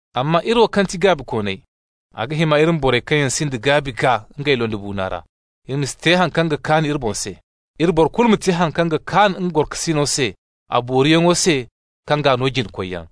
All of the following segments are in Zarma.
Amma iri wo kaŋ ti gaabikooney, a ga hima iri ma borey kaŋ yaŋ sinda gaabi gaa ngey londibuuna ra. Iri ma si te haŋ kaŋ ga kaan iri boŋ se. Iri boro kulu ma te haŋ kaŋ ga kaan nga gorokasino se a booriyaŋo se kaŋ g'a no jina-koyyaŋ.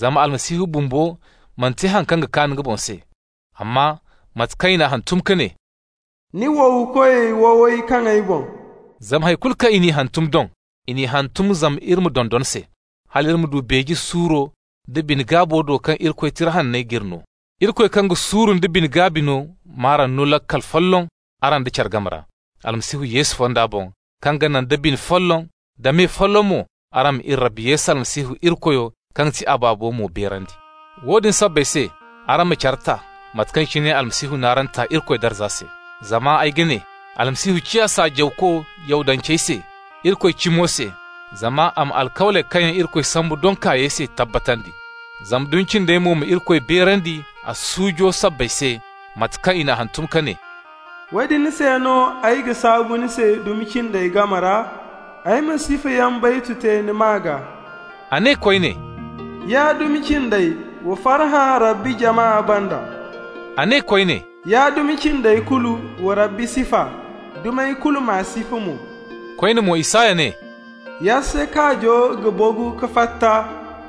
Zama Almasihu bumbo mana te haŋ kaŋ ga kaan nga boŋ se. Amma mate kaŋ i n'a hantum ka ne: «Ni wowkoy wowey kaŋ ay boŋ.» Zama hay kulu kaŋ i n'i hantum doŋ, i n'i hantum zama iri ma dondon se, hal iri ma du beeje suuro da bine-gaabo do kaŋ Irikoy Tira Hanney g'iri no. Irikoy kaŋ ga suuru nda bine-gaabi no m'araŋ no laakal folloŋ araŋ da care game ra, Almasihu Yesu fonda boŋ, kaŋ ga naŋ da bine folloŋ, da me folloŋ mo, araŋ ma iri Rabbi Yesu Almasihu Irikoyo, kaŋ ti a Baabo mo, beerandi. Woodin sabbay se, araŋ ma care ta, mate kaŋ cine Almasihu n'araŋ ta Irikoy darza se. Zama ay ga ne: Almasihu ciya saajawko Yahudancey se Irikoy cimo se, zama a ma alkawley kaŋ yaŋ Irikoy sambu doŋ kaayey se tabbatandi. Zama dumi cindey mo ma Irikoy beerandi a suujo sabbay se, mate kaŋ i n'a hantum ka ne: «Woodin se no ay ga saabu ni se dumi cindey game ra, Ay ma sifayaŋ baytu te ni maa gaa.» A ne koyne: «Ya dumi cindey, wa farhã Rabbi jama banda.» A ne koyne: «Ya dumi cindey kulu, wa Rabbi sifa. Dumey kulu, m'a sifa mo.» Koyne mo, Isaya ne: «Yasse kaajo ga bagu ka fatta,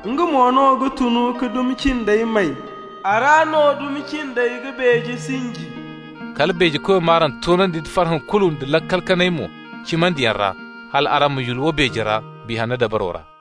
nga mo no ga tun ka dumi cindey may. A ra no dumi cindey ga beeje sinji.» Kala Beejekoyo m'araŋ toonandi nda farhã kulu da laakal kanay mo cimandiyaŋ ra, hal araŋ ma yulwa beeje ra, Biya Hanno dabaro ra.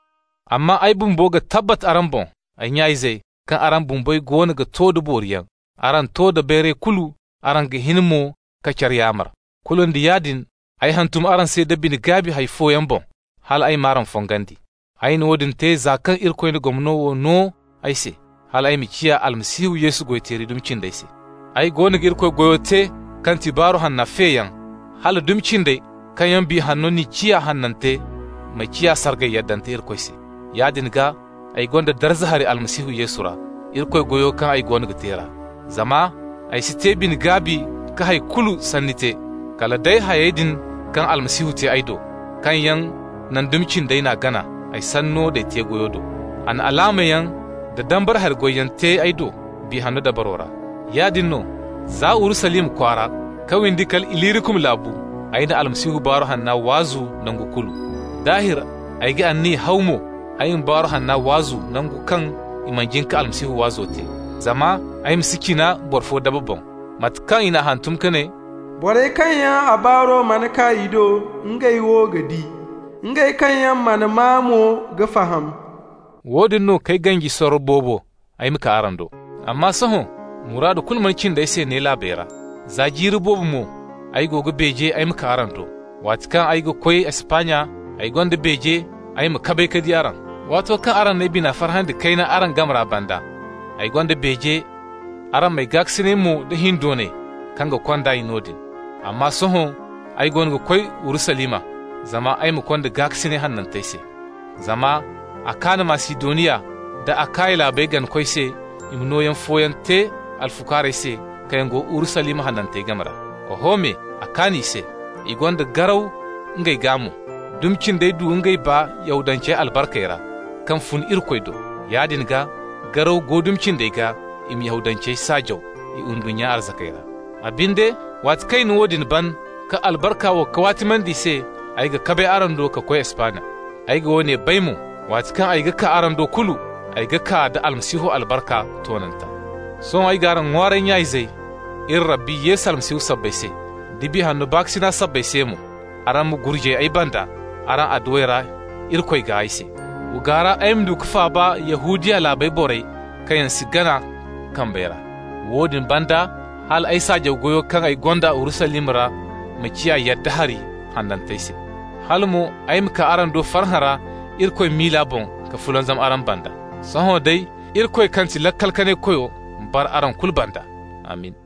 Amma ay bumbo ga tabbat araŋ boŋ, ay nya-izey, kaŋ araŋ bumbey goono ga to da booriyaŋ, araŋ to da bayray kulu, araŋ ga hin mo ka care yaamar. Kulu nda yaadin, ay hantum araŋ se da bine-gaabi hay fooyaŋ boŋ, hal ay m'araŋ fongandi. Ay na woodin te za kaŋ Irikoy na gomno wo no ay se, hal ay ma ciya Almasihu Yesu goy-teeri dumi cindey se. Ay goono ga Irikoy goyo te kaŋ ga ti Baaru Hanna feyaŋ, hala dumi cindey kaŋ yaŋ Biya Hanno n'i ciya hanante ma ciya sargay yaddante Irikoy se. Yaadin gaa, ay gonda darza hari Almasihu Yesu ra, Irikoy goyo kaŋ ay go ga te ra. Zama ay si te bine-gaabi ka hay kulu sanni te, kala day hayey din kaŋ Almasihu te ay do, kaŋ yaŋ naŋ dumi cindey n'a gana, ay sanno d'ay te-goyo do. A na alaamayaŋ da dambara hari goyyaŋ te ay do, Biya Hanno dabaro ra. Yaadin no, za Urusalima kwaara ka windi kala Ilirikum laabu, ay na Almasihu Baaru Hanna waazu nango kulu. Daahir, ay ga anniya haw mo ay ma Baaru Hanna waazu nangu kaŋ i mana jin ka Almasihu waazo te, zama ay ma si cina boro fo daba boŋ, mate kaŋ i n'a hantum ka ne: «Borey kaŋ yaŋ a baaro mana kaa i do, ngey wo ga di. Ngey kaŋ yaŋ mana maa mo ga faham.» Woodin no k'ay ganji sorro boobo ay ma kaa araŋ do. Amma sohõ, muraadu kulu mana cindi ay se ne laabey ra. Za jiiri boobo mo ay go ga beeje ay ma kaa araŋ do. Waati kaŋ ay ga koy Espanya, ay gonda beeje ay ma kabay ka di araŋ. Waato kaŋ araŋ n'ay bina farhandi kayna araŋ game ra banda, ay gonda beeje araŋ m'ay gaakasinay mo da hindoonay kaŋ ga kond'ay noodin. Amma sohõ ay goono ga koy Urusalima zama ay ma konda gaakasinay hanantey se. Zama a kaan Masidoniya nda Akaya laabey ganakoy se i ma nooyaŋ fooyaŋ te alfukaarey se kaŋ yaŋ go Urusalima hanantey game ra. Oho me, a kaan i se. I gonda garaw ngey gaa mo. Dumi cindey du ngey baa Yahudancey albarkey ra, kaŋ fun Irikoy do. Yaadin gaa, garaw go dumi cindey gaa i ma Yahudancey saajaw i ndunnya arzakey ra. A binde, waati kaŋ ay na woodin ban ka albarka wo kawaatimandi i se, ay ga kabay araŋ do ka koy Espanya. Ay ga woone bay mo: waati kaŋ ay ga kaa araŋ do kulu, ay ga kaa da Almasihu albarka toonanta. Sohõ ay g'araŋ ŋwaaray, nya-izey, iri Rabbi Yesu Almasihu sabbay se, da Biya Hanno baakasinay sabbay se mo: araŋ ma gurjay ay banda araŋ adduwey ra Irikoy gaa ay se. Wa gaara ay ma du ka faaba Yahudiya laabu borey kaŋ yaŋ si gana kambey ra. Woodin banda, hal ay saajaw goyo kaŋ ay gonda Urusalima ra ma ciya yadda hari hanantey se. Hala mo ay ma kaa araŋ do farhã ra Irikoy miila boŋ ka fulanzam araŋ banda. Sohõ day, Irikoy kaŋ ti Laakal-Kanay-Koyo ma bara araŋ kulu banda. Amin!